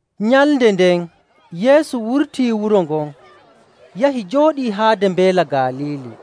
Nyalnde nden Yeesu wurtii wuro ngon, yahi jooɗii haade Mbeela Galiili.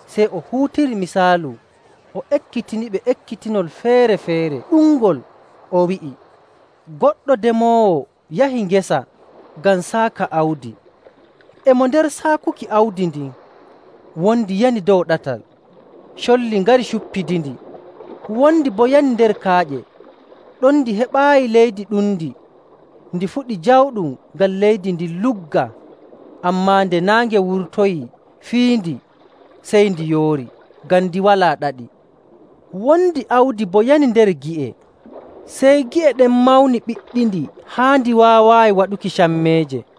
Sey o huutiri misaalu o ekkitiɓe ekkitinol feere‑feere ɗuɗngol, o wi'i, “Goɗɗo demoowo yahi ngesa ngam saaka awdi. E mo nder saakuki awdi ndin, wondi yani dow ɗatal, colli ngari cuppidindi. Wondi boo yani nder kaaƴe, ɗon ndi heɓaayi leydi ɗundi. Ndi fuɗi jawɗum ngam leydi ndin luggaa. Ammaa nde naange wurtoyii fiyindi, sey ndi yoori ngam ndi walaa ɗaɗi. Wondi awdi boo yani nder gi'e, sey gi'e ɗen mawni ɓiɗɗindi haa ndi waawaayi waɗuki cammeeje.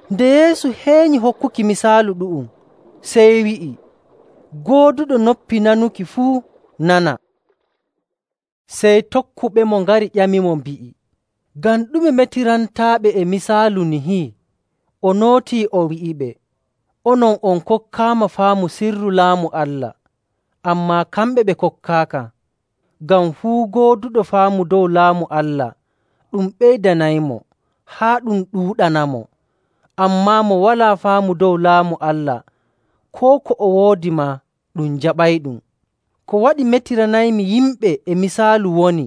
Nde Yeesu heenyi hokkuki misaalu ɗu'um, sey wi'i, “Gooduɗo noppi nanuki fuu nana.” Sey tokkuɓemo ngari ƴamimo, mbi'i, “Ngam ɗume metirantaaɓe e misaalu nihi?” O nootii o wi'iɓe, “Onon on kokkaama faamu sirru Laamu Allah, ammaa kamɓe ɓe kokkaaka. Ngam fuu gooduɗo faamu dow Laamu Allah ɗum ɓeydanaymo, haa ɗum ɗuuɗanamo. Ammaa mo walaa faamu dow Laamu Allah, koo ko o woodi maa ɗum jaɓayɗum.. Ko waɗi metiranaymi yimɓe e misaalu woni,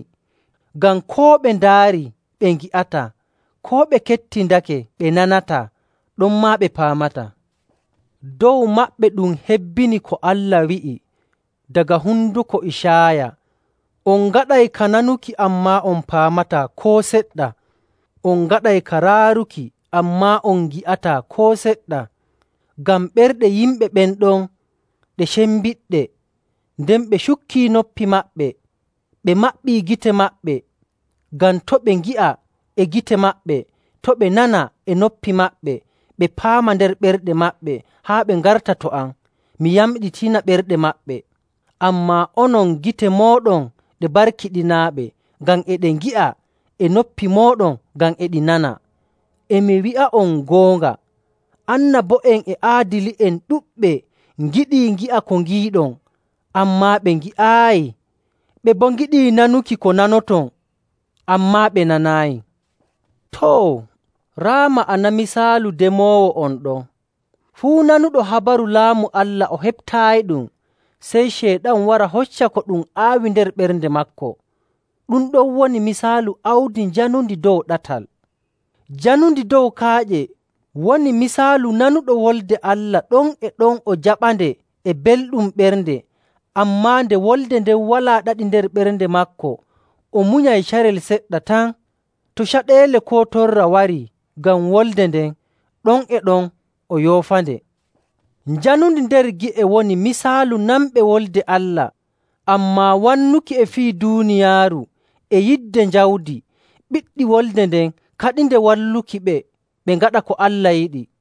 ngam koo ɓe ndaarii ɓe ngi'ataa, koo ɓe kettindake ɓe nanataa, ɗonmaa ɓe paamataa. Dow maɓɓe ɗum hebbini ko Allah wi'i daga honduko Icaaya, ‘On ngaɗay ka nanuki, ammaa on paamataa koo seɗɗa. On ngaɗay ka raaruki, ammaa on ngi'ataa koo seɗɗa. Ngam ɓerɗe yimɓe ɓen ɗon ɗe cembiɗɗe, nden ɓe cukkii noppi maɓɓe, ɓe maɓɓii gite maɓɓe, ngam to' ɓe ngi'a e gite maɓɓe, to' ɓe nana e noppi maɓɓe, ɓe paama nder ɓerɗe maɓɓe haa ɓe ngarta to am, mi yamɗitina ɓerɗe maɓɓe.’. “Ammaa onon, gite mooɗon ɗe barkiɗinaaɗe ngam e ɗe ngi'a, e noppi mooɗon ngam e ɗi nana. E mi wi'a'on goonga, annabo'en e aadili'en ɗuɗɓe ngiɗii ngi'a ko ngiiɗon, ammaa ɓe ngi'aayi. Ɓe boo ngiɗii nanuki ko nanoton, ammaa ɓe nanaayi.. “Too, raa ma'ana misaalu demoowo on ɗon. Fuu nanuɗo habaru Laamu Allah o heɓtaayiɗum, sey Ceyɗan wara hocca ko ɗum aawi nder ɓernde maako. Ɗum ɗon woni misaalu awdi njanundi dow ɗatal. Janundi dow kaaƴe woni misaalu nanuɗo Wolde Allah ɗon e ɗon o jaɓande e belɗum ɓernde. Ammaa nde wolde nden walaa ɗaɗi nder ɓernde maako, o munyay carel seɗɗa tan. To caɗeele koo torra warii ngam wolde nden, ɗon e ɗon o yoofande. Janundi nder gi'e woni misaalu nanɓe Wolde Allah, ammaa wannuki e fii duuniyaaru, e yidde jawdi, ɓiɗɗi wolde nden kaɗinde wallukiɓe ɓe ngaɗa ko Allah yiɗi.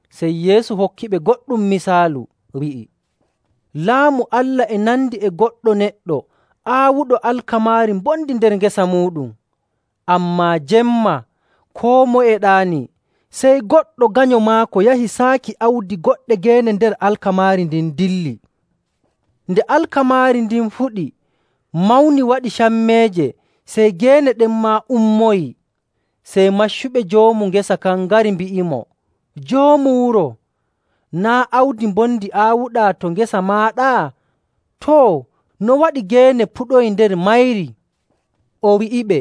Sey Yeesu hokkiɓe goɗɗum misaalu wi'i, “Laamu Allah e nandi e goɗɗo neɗɗo aawuɗo alkamaari mbondi nder ngesa muuɗum. Ammaa jemma, koo moye e ɗaanii, sey goɗɗo ganyo maako yahi saaki awdi goɗɗe geene nder alkamaari ndin dilli. Nde alkamaari ndin fuɗi, mawni waɗi cammeeje, sey geene ɗen maa ummoyii. Sey maccuɓe joomu ngesa kan ngari mbi'imo, ‘Joomu wuro, naa' awdi mbondi aawuɗaa to ngesa maaɗa? Too, no waɗi geene puɗoyi nder mayri?’ O wi'iɓe,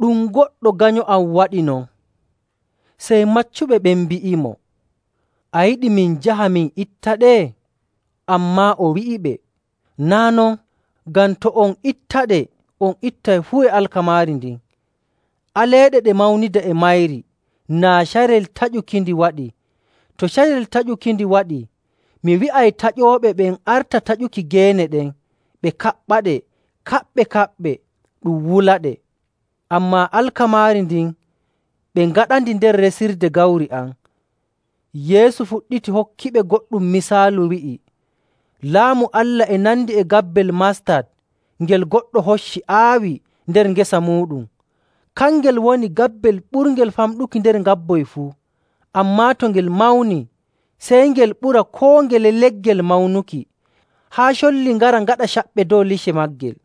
‘Ɗum goɗɗo ganyo am waɗi non.’ Sey maccuɓe ɓen mbi'imo, ‘A yiɗi min njaha min ittaɗe?’ Ammaa o wi'iɓe, ‘Naa' non. Ngam to on ittaɗe, on ittay fuu e alkamaari ndin. Aleeɗe ɗe mawnida e mayri naa carel taƴukindi waɗi. To carel taƴukindi waɗi, mi wi'ay taƴooɓe ɓen arta taƴuki geene ɗen ɓe kaɓɓaɗe kaɓɓe‑kaɓɓe, ɗum wulaɗe. Ammaa alkamaari ndin, ɓe ngaɗandi nder resirde gawri am.’” Yeesu fuɗɗiti hokkiɓe goɗɗum misaalu wi'i, “Laamu Allah e nandi e gabbel mastat ngel goɗɗo hocci aawi nder ngesa muuɗum. Kangel woni gabbel ɓurngel famɗuki nder ngabboy fuu, ammaa to ngel mawni, sey ngel ɓura koo ngele leggel mawnuki, haa colli ngara ngaɗa caɓɓe dow lice maagel.”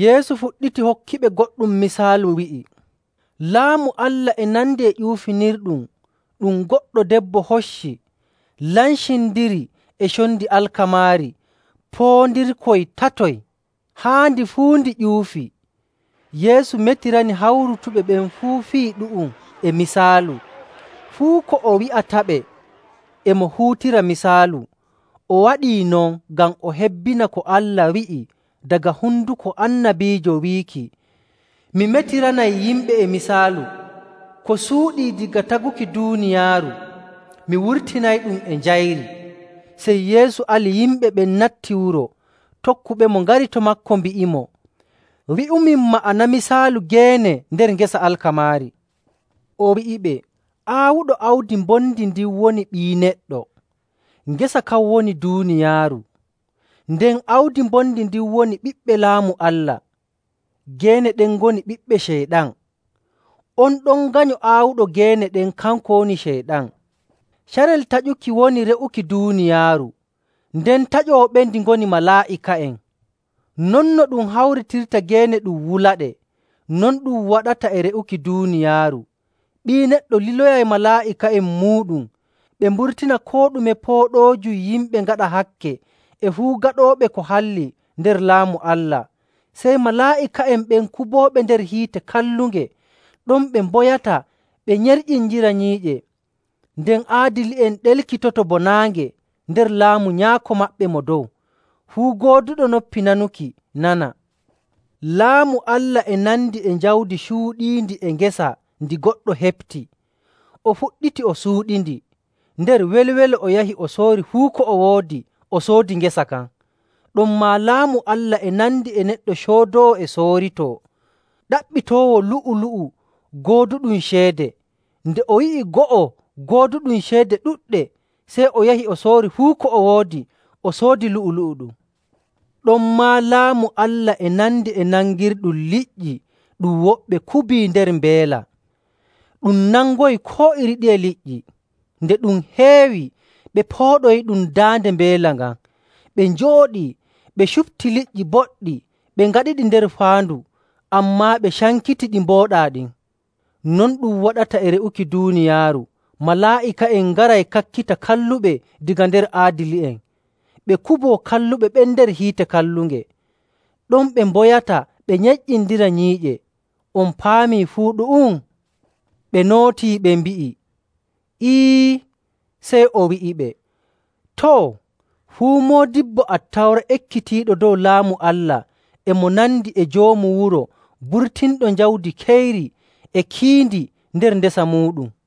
Yeesu fuɗɗiti hokkiɓe goɗɗum misaalu wi'i, “Laamu Allah e nandi e ƴuufinirɗum ɗum goɗɗo debbo hocci lancindiri e condi alkamaari poondirkoy tatoy, haa ndi fuu ndi ƴuufi.” Yeesu metirani hawrutuɓe ɓen fuu fii ɗu'um e misaalu. Fuu ko o wi'ataɓe e mo huutira misaalu. O waɗii non ngam o hebbina ko Allah wi'i daga honduko annabiijo wiiki, “Mi metiranay yimɓe e misaalu. Ko suuɗii daga taguki duuniyaaru, mi wurtinayɗum e njayri.”. Sey Yeesu ali yimɓe ɓen natti wuro. Tokkuɓemo ngari to maako mbi'imo, “Wi'umin ma'ana misaalu geene nder ngesa alkamaari.” O wi'iɓe, “Aawuɗo awdi mbondi ndin woni Ɓii Neɗɗo. Ngesa kan woni duuniyaaru. Nden awdi mbondi ndin woni ɓiɓɓe Laamu Allah. Geene ɗen ngoni ɓiɓɓe Ceyɗan. On ɗon ganyo aawuɗo geene ɗen, kanko woni Ceyɗan. Carel taƴukindi woni re'uki duuniyaaru, nden taƴooɓendi ngoni malaa'ika'en. Non no ɗum hawritirta geene ɗum wulaɗe, non ɗum waɗata e re'uki duuniyaaru. Ɓii Neɗɗo liloyay malaa'ika'en muuɗum, ɓe mburtina koo ɗume pooɗoojum yimɓe ngaɗa hakke e fuu gaɗooɓe ko halli nder Laamu Allah. Sey malaa'ika'en ɓen kubooɓe nder hiite kallunge. Ɗon ɓe mboyata ɓe nyerƴindira nyiiƴe. Nden aadili'en ɗelkitoto bo naange nder Laamu Nyaako maɓɓe Mo Dow. Fuu gooduɗo noppi nanuki nana. “Laamu Allah e nandi e jawdi cuuɗiindi e ngesa ndi goɗɗo heɓti, o fuɗɗiti o suuɗindi. Nder welwelo o yahi, o soori fuu ko o woodi o soodi ngesa kan. “Ɗonmaa Laamu Allah e nandi e neɗɗo coodoowo e sooritoo ɗaɓɓitoowo lu'u‑lu'u gooduɗum ceede. Nde o yi'i go'o gooduɗum ceede ɗuɗɗe, sey o yahi o soori fuu ko o woodi, o soodi lu'u‑lu'u ɗum. “Ɗonmaa Laamu Allah e nandi e nangirɗum liƴƴi ɗum woɓɓe kubii nder mbeela, ɗum nangoyi koo iri ɗiye liƴƴi. Nde ɗum heewi, ɓe pooɗoyiɗum daande mbeela ngan, ɓe njooɗii, ɓe cupti liƴƴi boɗɗi, ɓe ngaɗiɗi nder faandu, ammaa ɓe cankiti ɗi mbooɗaa ɗin. Non ɗum waɗata e re'uki duuniyaaru. Malaa'ika'en ngaray kakkita kalluɓe daga nder aadili'en, ɓe kuboo kalluɓe ɓen nder hiite kallunge. Ɗon ɓe mboyata ɓe nyerƴindira nyiiƴe. “On paamii fuu ɗu'um?” Ɓe nootii ɓe mbi'i, “Ee.” Sey o wi'iɓe, “Too, fuu moodibbo Attawra ekkitiiɗo dow Laamu Allah e mo nandi e joomu wuro burtinɗo jawdi keyri e kiindi nder ndesa muuɗum.”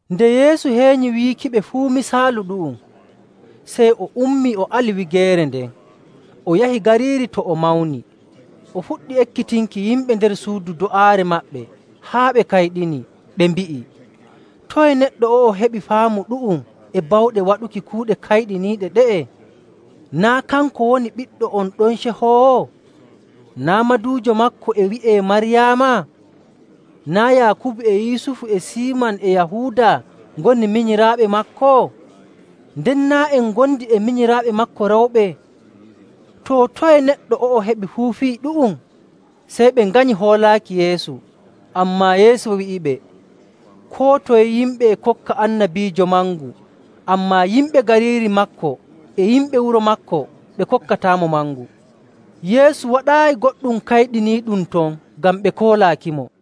Nde Yeesu heenyi wiikiɓe fuu misaalu ɗu'um, sey o ummii o ali wigeere nden. O yahi gariiri to o mawni, o fuɗɗi ekkitinki yimɓe nder suudu do'aare maɓɓe haa ɓe kayɗini, ɓe mbi'i, “Toye neɗɗo o'o heɓi faamu ɗu'um e bawɗe waɗuki kuuɗe kayɗiniiɗe ɗe'e? Naa' kanko woni ɓiɗɗo on ɗon cehoowo? Naa' maduujo maako e wi'ee Maryaama? Naa' Yaakubu e Yusufu e Siiman e Yahuuda ngoni minyiraaɓe maako? Nden naa' en ngondi e minyiraaɓe maako rewɓe? Too, toye neɗɗo o'o heɓi fuu fii ɗu'um?” Sey ɓe nganyi hoolaaki Yeesu. Ammaa Yeesu wi'iɓe, “Koo toye yimɓe e kokka annabiijo mangu, ammaa yimɓe gariiri maako, e yimɓe wuro maako ɓe kokkataamo mangu.”. Yeesu waɗaayi goɗɗum kayɗiniiɗum ton ngam ɓe koolaakimo.